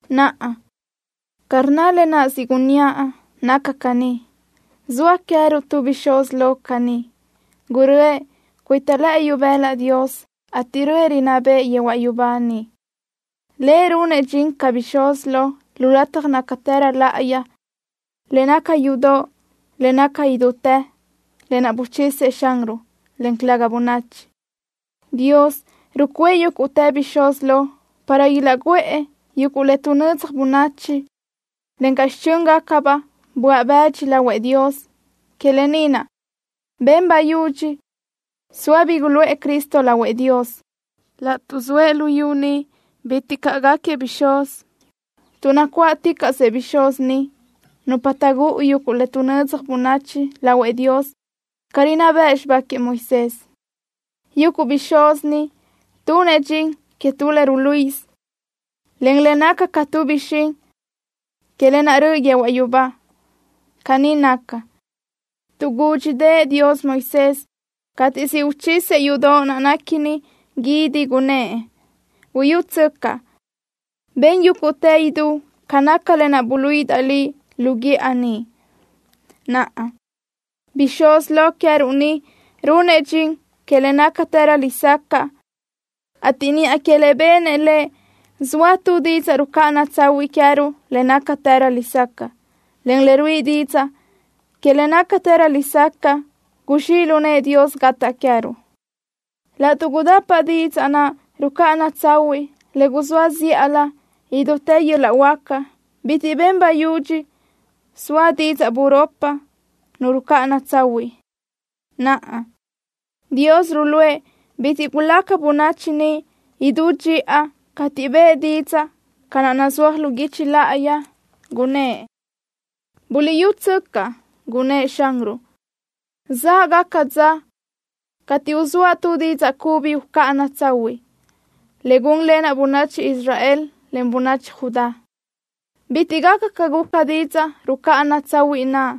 Naʼa, ca rnna lë naʼ siʼ gunníaʼ, naca caní: Zoa queë́ruʼ tu Bixúz Lo caní. Guröʼë cuita lëʼë ibëla Dios, ateʼ röʼë, rinná bëʼë yehuaʼ yubá niʼ. Lëʼ runëʼ dxin ca Bixúz Lo lu lataj nácatërö láʼayi, le naca yudoʼ le naca idútë, lë naʼ buchisëʼ Xanruʼ, en calëga bönachi. Dios rucuʼë yúguʼtë bixúz lo para ilaʼguʼë yuguʼ le tuʼnödzaj bönachi, encaʼ xichö́ngacabaʼ böaʼ bëdxi lahuëʼ Dios. Que lë ni naʼ ben bayudxi soa bi guluʼë Cristo lahuëʼ Dios. Laʼtuʼ zoëʼ luyú ni, bitiʼ caʼ gáquiëʼ bixúz, tuʼ nacuáʼticaʼsëʼ bixúz ni, nupa taʼgúʼu yuguʼ le tuʼnödzaj bönachi lahuëʼ Dios ca rinná bëʼ xibá queëʼ Moisés. Yuguʼ bixúz ni tunëʼ dxin que tu le ruluíʼisö, en le naca ca tu bixín que lë naʼ röʼö yehuaʼ yubá. Caní naca, tuʼ gúdxidëʼë Dios Moisés cateʼ siʼ uchisëʼ yúʼudoʼ naʼ néquini guídi, gunnë́ʼ: “Buyútsöcaʼ, ben yúguʼtë idú ca naca lë naʼ buluíʼidaʼ liʼ lu guíʼa niʼ.” Naʼa, Bixúz Lo queë́ruʼ ni runëʼ dxin que le nácatërö lesacaʼ, ateʼ niʼa que le benëʼ Lëʼ zoa tu didzaʼ rucáʼana tsahuiʼ queë́ruʼ le nácatërö lesacaʼ, en le ruíʼi didzaʼ que le nácatërö lesacaʼ guzxíʼ lu nëʼë Dios gataʼ queë́ruʼ. Laʼtuʼ gudapa didzaʼ naʼ rucáʼana tsahuiʼ le guzóa zíʼalö idútë yöl-laʼ huáca, bitiʼ ben bayudxi soa didzaʼ buropi ni rucáʼana tsahuiʼ. Naʼa, Dios ruluʼë bitiʼ gulaca bönachi niʼ idú dxiʼa cateʼ bëʼë didzaʼ ca naʼ nazúaj lu guichi láʼayi, gunnë́ʼ: Buliʼyútsöcaʼ, gunnë́ʼ Xanruʼ: Záʼgaca dza cateʼ uzóaʼ tu didzaʼ cubi ucáʼana tsahuiʼ, le gúnlenaʼ bönachi Israel, en bönachi Judá. Bitiʼ gaca ca guca didzaʼ rucáʼana tsahuiʼ naʼ,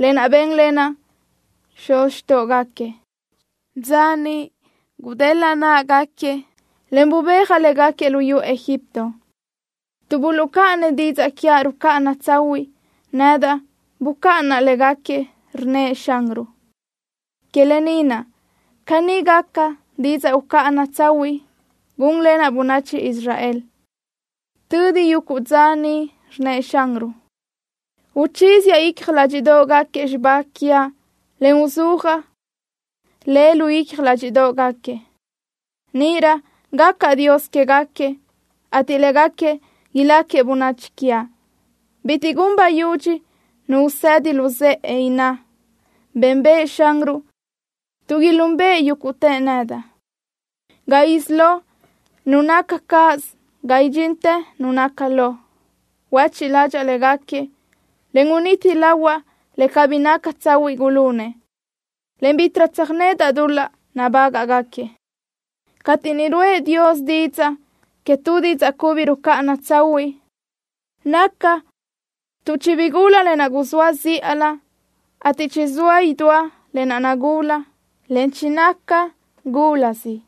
lë naʼ bénlenaʼ xuz xtóʼogaquiëʼ, dza niʼ gudélaʼa náʼagaquiëʼ, en bubéajaʼ légaquiëʼ luyú Egipto. Tuʼ buluʼcáʼanëʼ didzaʼ quiaʼ rucáʼana tsahuiʼ, nedaʼ bucáʼanaʼ légaquiëʼ, rnnëʼ Xanruʼ. Que lë ni naʼ, caní gaca didzaʼ ucáʼana tsahuiʼ gúnlenaʼ bönachi Israel tödi yuguʼ dza niʼ, rnnëʼ Xanruʼ. Uchíziaʼ icja ládxiʼdoʼgaquiëʼ xibá quiaʼ en uzúajaʼ le lu icja ládxiʼdoʼgaquiëʼ. Níʼirö gacaʼ Dios quégaquiëʼ ateʼ légaquiëʼ iláquiëʼ bönachi quiaʼ. Bitiʼ gun bayudxi nu usedi luzë́ʼe, inná: Bénbëʼë Xanruʼ, tuʼ ilúnbëʼë yúguʼtëʼ nedaʼ, ga isí lo nu naca cáʼasö, ga idxintë nu naca lo. Huéchiʼ ládxaʼa légaquiëʼ, en uniti lahuaʼ le cabí naca tsahuiʼ gulunëʼ, en bítiʼrö tsöjnedaʼ dul-laʼ nabágaʼgaquiëʼ. Cateʼ niʼ ruʼë Dios didzaʼ que tu didzaʼ cubi rucáʼana tsahuiʼ, naca tuʼ chibigula lë naʼ guzóa zíʼalö, ateʼ chizóa idúa lë naʼ nagula, en chinaca gulasi.